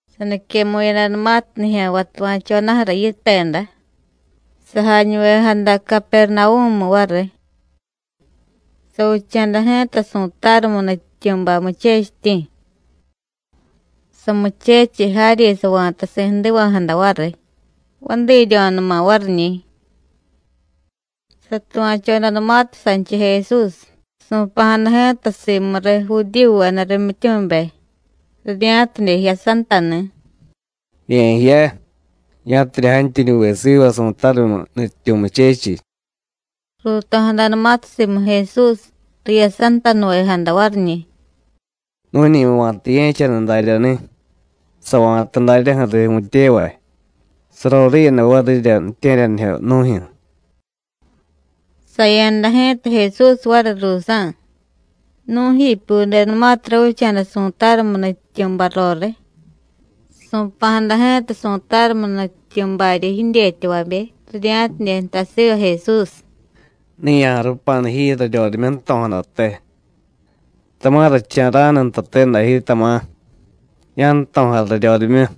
Saniquemu̱yadanumatiy nijya̱nvay tuva̱chodaju̱ra yiteda, sajañuvejada Capernavú̱mu variy. Savicha̱da ji̱ta su̱tarumiy nutyityu̱bay, muchechityi̱. Samuchechiy jaryi sava̱tasi̱ jdiva̱jada variy, vadiiryo̱numa variñi̱. Satuva̱chodanumatiy sanchiy Jesús, su̱pa̱jada ji̱ta simuriy Judíyuveda rimyityumibe, rirya̱tidye jiyasantani̱: “Ye̱jiya, ya̱tidye jantyuñuve siva su̱tarumiy nutyityu̱ muchechiy.” Ruuto̱jadanumatiy simu Jesús, riyasantanuvejada variñi̱: “Nu̱ñi va̱ta ye̱chaniy daryani̱, sava̱ta daryaju̱riy vu̱tyevay, saroriiyada varirya ju̱tye̱ryanijyo nu̱jyu̱.” Saya̱da ji̱ta Jesús variy ruusa̱. Nu̱jipyudenumatiy ravicha̱da su̱tarumiy nutyityu̱bay roriy, su̱pa̱jada ji̱ta su̱tarumiy nutyityu̱baryi jidyetyavabe, rirya̱tidye jtay siva Jesús: “Ne ya̱jarupanu ji raryorimyu jto̱jadate, tama̱ racha̱ra̱nu ntate day ji, tama̱ ya̱jto̱jay raryorimyu.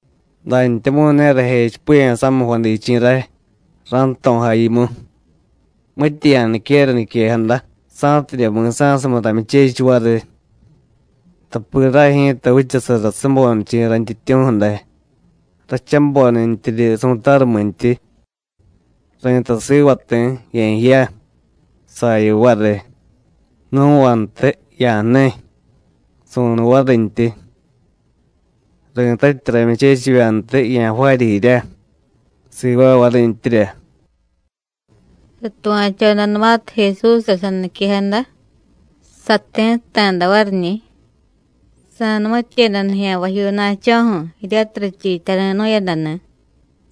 Dantyamu̱y ne rajechipiya̱ samiy jvadichi̱ ray, ra̱jto̱jay yimu. Mitya ya̱niquera niquejada, sa̱tidye mi̱sa̱sumiy ramyuchechiy variy. Tapi ray ji̱ta vichasara sabonichi̱ rayntyityu̱ju̱ day, rachabonintyiryi su̱tarumintyi. Ri̱tay siva ti̱: ¡Ye̱jiya! saya variy; nu̱vantiy: ¡Ya̱jniy! su̱niy varintyi; ri̱tatyi ramyuchechivyantiy, ¡Ya̱jvaarya jirya! sivaay varintyirya.” Satuva̱chodanumatiy Jesúsra saniquejada, sati̱tta̱da variñi̱, sa̱numityeda nijya̱nvajyuuna̱cho̱ju̱ jiryatiy richiityari̱nu̱yadani̱,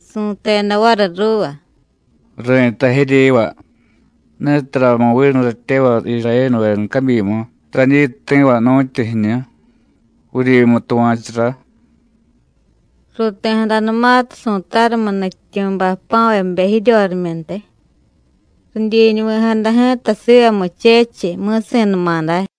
su̱teda variy ruuva: “Ri̱tay jiryiva: Netaramu vinu ratyevay Irayénuveda cabyimu radyi ti̱va nu̱tyu jiñu, vuryimu tuva̱churá.” Ruuti̱jadanumatiy su̱tarumiy nutyityu̱bay jpa̱vabe jiryorimyuntiy, ridyiñuvi̱jada ji̱ta siva muchechiy, mi̱si̱numa day.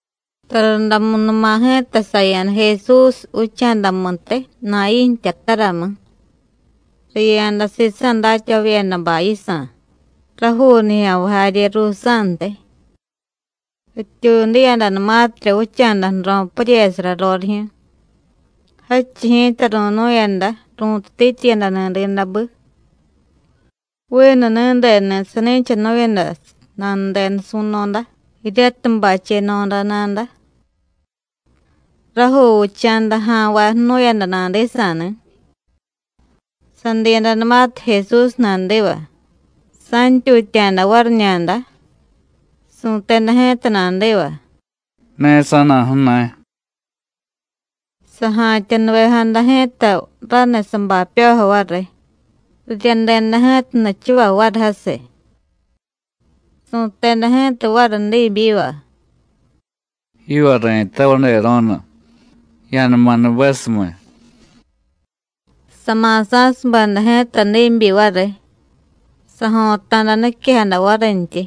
Tarundamunuma ji̱ta saya̱da Jesús vicha̱damuntiy, Nayí̱ jtyataramu. Riya̱da sisa̱ datyavavyedabay yisa̱, rajuu nijya̱nvay jarye ruusa̱ntiy. Rityuudiyadanumatirya vicha̱da ju̱ro̱ puryesara rorijyu̱, jadchiy ji̱ta ru̱nu̱yada ru̱tutityiyadani̱ diidabi. Vinu ni̱deni̱ sani̱chanu̱yada nanudenu su̱no̱da, jiryatiy bacheno̱da nada. Rajuu vicha̱da ja̱nvay jnu̱yada nadisa̱ni̱. Sadiyadanumatiy Jesús nadiva, sa̱ntyutya̱da variñada. Su̱teda ji̱ta nadiva: “Ne sa̱na̱ju̱na̱y.” Saja̱tya̱nuvejada ji̱ta raniy sabapyojo variy. Riryadeda ji̱ta nichuvay variy jasiy. Su̱teda ji̱ta variy diibyiva: “Yiva ri̱tay, Vadero̱nu, ¡Ya̱numa nubesumiy!” Sama̱sa̱subeda ji̱ta diibyi variy, sajo̱ta̱da niquejada varintyi.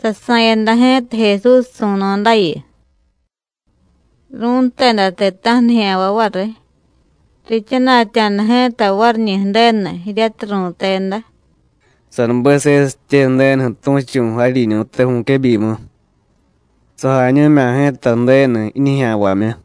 Sasa̱yada ji̱ta Jesús su̱no̱dayu. Ru̱nteda ti̱ta̱ju̱ nijya̱nvay variy, riichana̱tya̱da ji̱ta variñi̱ Ju̱denu, jiryatiy ru̱teda: “¡Sanubesesitye Ju̱denuju̱ tu̱chu̱ jaryiñu̱te vu̱quebyimu! ¡Sajañu̱mya̱ ji̱ta Ju̱denu jiñijya̱nvamyu!”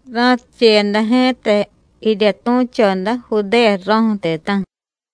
Ra̱ticheyada ji̱ta jirya tu̱choda, Judéya ju̱ro̱ju̱ ti̱ta̱ju̱.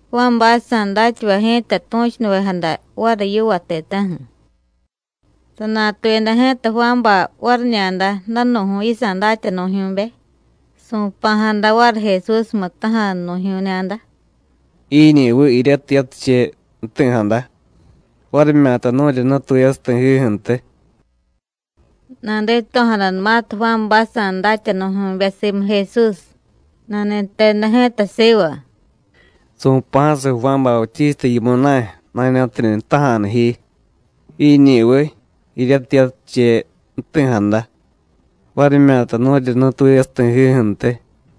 Juánbaysa̱ datyavay ji̱ta tu̱chunuvejada variy yiva ti̱ta̱ju̱. Sanatuyada ji̱ta Juánbay variñada danu̱ju̱y yisa̱ datyanu̱jyu̱be, su̱pa̱jada variy Jesúsmu jtaja̱nu̱jyu̱ñada: “¿Jiñi̱viy jiryatiy yatiche jti̱jada, varimyata nu̱ryi nutuyasiy ti̱jiju̱ntiy?” Nadito̱jadanumatiy Juánbaysa̱ datyanu̱jyu̱be simu Jesús, nani̱teda ji̱ta siva: “Su̱pa̱jasiy Juán Bautísta yimu na̱y, na̱ña̱tidye jtaja̱nu ji: ¿Jiñi̱viy jiryatiy yatiche jti̱jada, varimyata nu̱ryi nutuyasiy ti̱jiju̱ntiy.”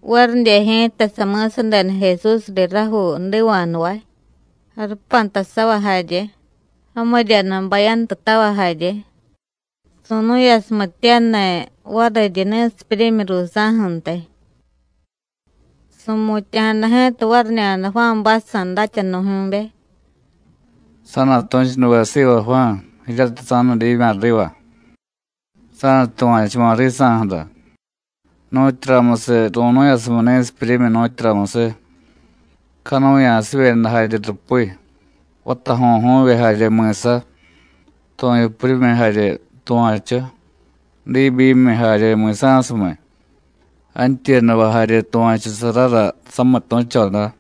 Varidye ji̱ta sami̱sadeda Jesús riy rajuu jdiva̱jnuvay, jarupantasavay jarye, jamiryanu bayantu tavay jarye, su̱nu̱yasumityaniy variryi ni̱sipyuryimyi ruusa̱ju̱ntiy. Su̱mutya̱jada ji̱ta variñada Juánbaysa̱ datyanu̱jyu̱be: “Sa̱na̱tu̱chunuve siva Juán jiryatiy sa̱nudimya̱ riva, sa̱nutuva̱chuma̱ risa̱ju̱ra, nu̱tyuramusiy ru̱nu̱yasumiy ni̱sipyuryimyi, nu̱tyuramusiy, canuya̱sivyeda jarye rupi, vatajo̱ju̱vye jarye mi̱sa, tu̱yupuryimyi jarye tuva̱chu, diibyimiy jarye mi̱sa̱sumiy, jantyuyadavay jarye tuva̱chusarara samitu̱choda.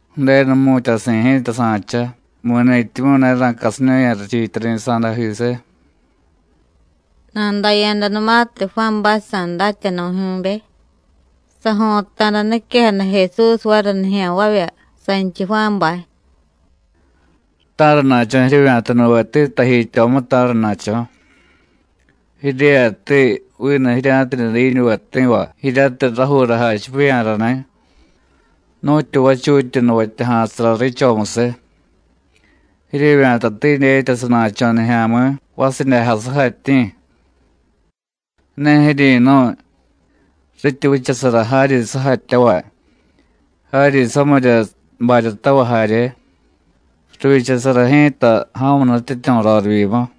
Ju̱denu jmu̱tyasi̱ ji̱ta sa̱cha mi̱ni̱tyimyu̱ ne ra̱casinu̱ya̱ rachiityari̱sa̱dajisiy.” Nadaya̱danumatiy Juánbaysa̱ datyanu̱jyu̱be, sajo̱ta̱da niquejada Jesús variy nijya̱nvavya sanchiy Juánbay. “Ta̱rana̱cho̱ jiryevya̱tanuveti tajityomu, ta̱rana̱cho̱? ¿Jiryeyati vinu jirya̱tidye diñuve ti̱va jiryatiy rajuura jachipiya̱rani̱, nu̱tyu vachutyi nuvatyaja̱sara riichomusiy? ¿Jiryevya̱tati dyetya sana̱cho̱ nijya̱mi̱ vasidyajay sujatyi̱? Ne jiryi̱nu̱y, rityi vichasara jaryi sujatyavay, jaryi samirya baryatavay jarye, rivyichasara ji̱ta ja̱mu nutyityu̱ rorivyimu.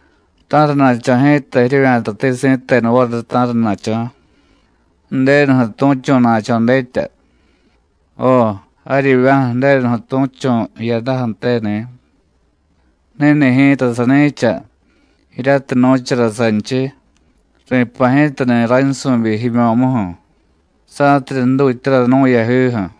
¿Ta̱rana̱cho̱ ji̱ta jiryevya̱tati si̱tenu variy, ta̱rana̱cho̱? ¿Ju̱denuju̱ tu̱chu̱na̱cho̱ dyetya? Jo, jaryivya̱ju̱ Ju̱denuju̱ tu̱chu̱ jiyadaju̱teni̱. Ni̱ni̱ ji̱ta sani̱cha, jiryatiy nu̱chara sanchiy: Ri̱pa̱ ji̱tani̱ raynsu̱byi jimyo̱muju̱, sa̱tidye jdutyara nú̱ yajiju̱.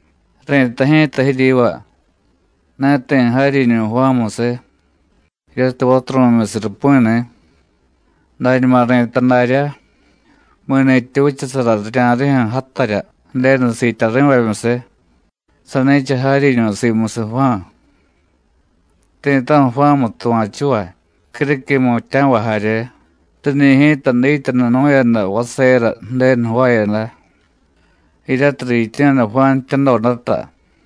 Ri̱tay ji̱ta jiryiva: Ne ti̱ jaryiñu̱ Juánmusiy, jiryatiy vaturu̱myusiy rupi̱ni̱. Dañuma ri̱tay daryá, mi̱ni̱tyi vichasara rirya̱rijyu̱ játarya Ju̱denu siityari̱vamyusiy, sani̱cha jaryiñu̱ simusiy Juán. Ti̱ta̱ju̱ Juánmu tuva̱chuvay, criquiy jmutya̱vay jarye, riñi̱ ji̱ta dityanunu̱yada vasera Ju̱denu jvaayada, jiryatiy riityu̱yada Juán jtyadodata.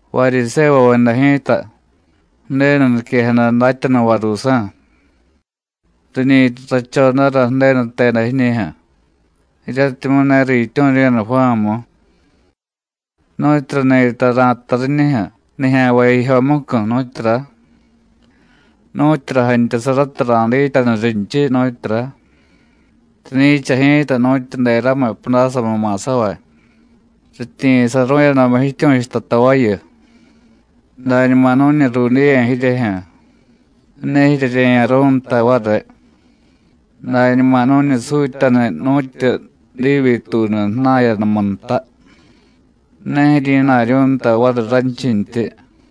Varyisévuveda ji̱ta, Ju̱denu niquejada datyanuvay ruusa̱, riñi rrachodara Ju̱denu jteda jiñijyu̱, jiryatimyu̱ ne riityu̱ryu̱yada Juánmu. ¿Nu̱tyura ni̱ta ra̱jtay riñijyu̱ nijya̱nvay jijyomucu̱, nu̱tyura? ¿Nu̱tyura jantyasarata ra̱dityanu rinchiy, nu̱tyura? Riñi̱cha ji̱ta nu̱tyu deramiy pudásamu ma̱savay. Rityiyi̱saru̱yadamu jityu̱chuta tavayu: Dañuma nu̱ñi ruudiye̱ jiryejyu̱, ne jiryerye̱ya̱ru̱y nta variy. Dañuma nu̱ñi sutyaniy nu̱tyu diibyituunu jna̱yadamu nta, ne jiryi̱na̱ryu̱y nta variy ranchintyi.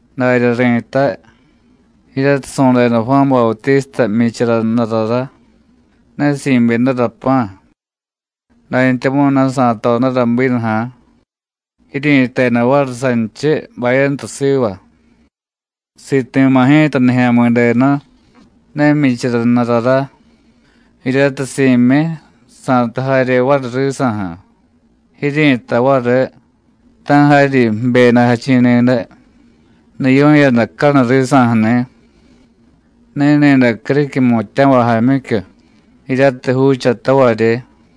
Darya ri̱tay, jiryatiy su̱deda Juán Bautísta jmyichara jnurará: ne si̱byedara pa̱, dantyamu̱y ne sa̱todara bínuja̱, jiryi̱teda variy sanchiy: Bayantu siva. Siti̱ma̱ ji̱ta Nijya̱mi̱denu ne jmyichara jnurará, jiryatiy si̱myi, sa̱tu jarye variy risa̱ju̱. Jiryi̱tay variy: Ta̱ jaryi jibyedajachi̱ ni̱day, niyu̱yadacanuy risa̱ju̱ni̱. Ni̱ni̱day criquiy jmutya̱vay jaamyicyu, jiryatiy juuchatavaryi.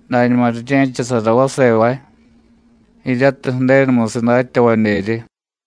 Dañuma rirye̱chasara vasevay jiryatiy Ju̱denumusiy datyavadyeryi.”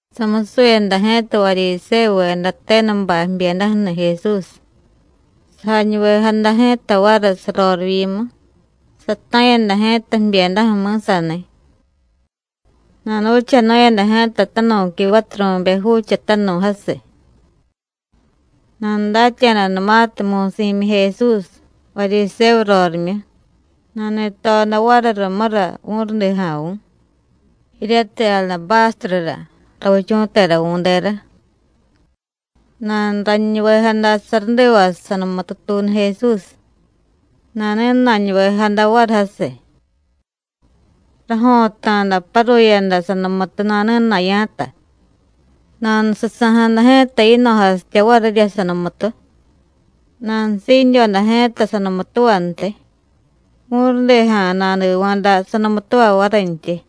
Samusuyada ji̱ta Varyisévuveda tenubay jbyedaju̱ni̱ Jesús, sajañuvejada ji̱ta variy sarorivyimu, sata̱yada ji̱ta jbyedaju̱ mi̱saniy. Nanuvichanu̱yada ji̱ta tanu̱qui vaturu̱be juuchatanu̱y jasiy. Nanudatya̱danumatiy: Mu̱y si̱myi Jesús, Varyisévu rorimyu, nani̱toda variy rumura vu̱rudija̱vu̱, jiryatiy adabástrura ravichu̱teravu̱dera. Nanuraniñuvejada sarudivasiy sanumututuunu Jesús, nani̱na̱ñuvejada variy jasiy. Rajo̱ta̱da paruyada sanumutu nani̱na̱ya̱ta, nanususa̱jada ji̱ta yino̱jasitya varirya sanumutu. Nanusiidyoda ji̱ta sanumutuvantiy, vu̱rudija̱ nadiva̱da sanumutuva varintyi.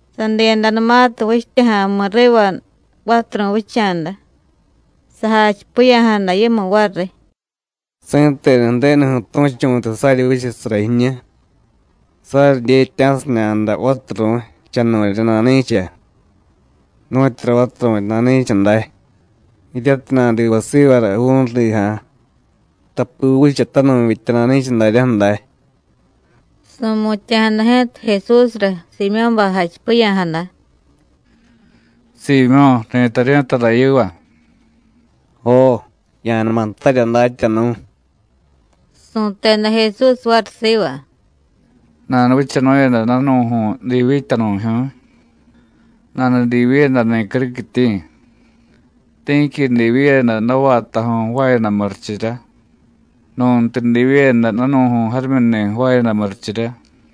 Sadiyadanumatiy vichtya ja̱mi̱ riva vaturu̱y vicha̱da, sajachipiya̱jada yimu variy: “Si̱tenu Ju̱denuju̱ tu̱chu̱tiy saryivyichasara jiñu, saryidyetya̱siñada vaturu̱y, chanu̱rya nani̱cha, nu̱tyura vaturu̱y nani̱cha day, jiryatiy nadivá sivara vu̱rudija̱, tapi juuchatanu̱y vitya nani̱cha daryaju̱ day.” Su̱mutya̱jada ji̱ta Jesúsra Siimyó̱bay jachipiya̱jada: “Siimyó̱, ri̱taryu̱y tara yiva.” “Jo, ya̱numa jtarya, Datyanu̱.” Su̱teda Jesús variy siva: “Nanuvichanu̱yada danu̱ju̱y divyityanu̱jyu̱y, nanudivyiyadani̱ criquityi̱. Ti̱qui divyiyada davaatajyu̱y jvaayada murichirya, nu̱ntiy divyiyada danu̱ju̱y jarimyuni̱ jvaayada murichirya.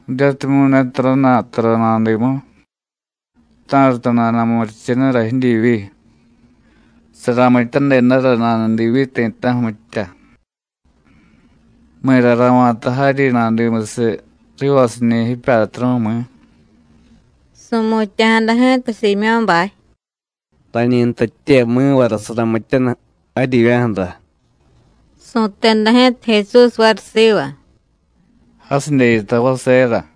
Jiryatimyu̱ ne tarajna̱y tara nadimu, ta̱rata nana̱murichenura jidyivyi, saramityadedara nanudivyiy ti̱ta̱ju̱ mitya. ¿Mi̱ra ra̱va̱ta jaryi nadimusiy rivasiñi̱ jipyatru̱, mi̱?” Su̱mutya̱jada ji̱ta Siimyó̱bay: “Rañi jtatye mi̱vara saramityaniy jaryivya̱ju̱ra.” Su̱teda ji̱ta Jesús variy siva: “Jasidye yitay vasera.”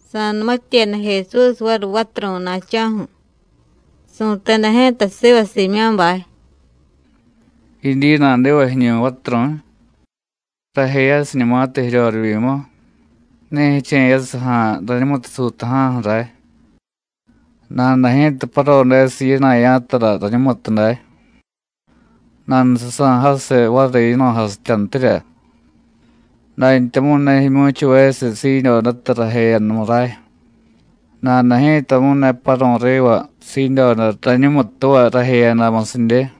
Sa̱numityeda Jesús variy vaturu̱y na̱cho̱ju̱, su̱teda ji̱ta siva Siimyó̱bay; “¿Jidyi nadiva jiñu̱y vaturu̱y? Rajeyasiñumatiy jiryorivyimu, ne jiche̱yasiy ja̱a̱ rañumutu suuta̱ja̱ju̱ ray. Nada ji̱ta parodesiy yina̱ya̱tara rañumutuday, nanususa̱ jasiy variy yino̱jasityantirya. Dantyamu̱y ne jimyu̱chuvesiy siidyodata rajeyadamu ray, nada ji̱tamu̱y ne paru̱y riva siidyoda rañumutuva rajeyadamusidye.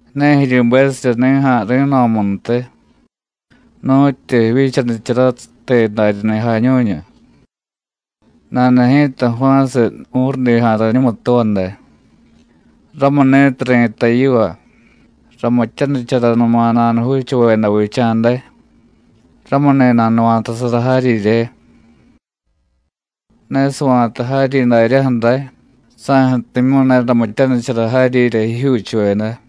Ne jiryubesirya ni̱ja̱ ri̱no̱muntiy, nu̱tyu jivyichanicharatiy daryani̱ jañu̱ñu, nada ji̱ta jva̱siy vu̱rudija̱ rañumutuva day. Ramuni̱tiy ri̱tay yiva: Ramityanicharanuma nanujuuchuvedavicha̱ day, ramuni̱ nanuva̱tasara jaryirye. Ne sava̱ta jaryi daryaju̱ ray, saju̱timyu̱y ne ramityanichara jaryirya jijyuuchuveda.”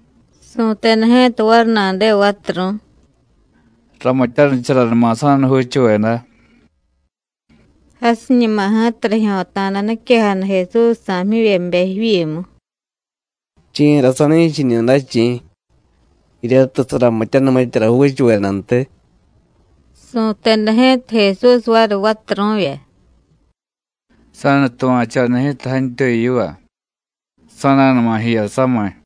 Su̱teda ji̱ta variy nadiva vaturu̱y: “Ramityanicharanuma sa̱nujuuchuveda.” Jasiñuma ji̱ta rijyo̱ta̱da niquejada Jesúsjsa̱ jmyivyebe jivyimu: “¿Chi̱ra sani̱cha jiñu day, chi̱? jiryatiy saramityaniy mityara juuchuvedantiy.” Su̱teda ji̱ta Jesús variy vaturu̱vya: “Sa̱nutuva̱choda ji̱ta jantyuy yiva, sa̱nunuma jiya samiy.”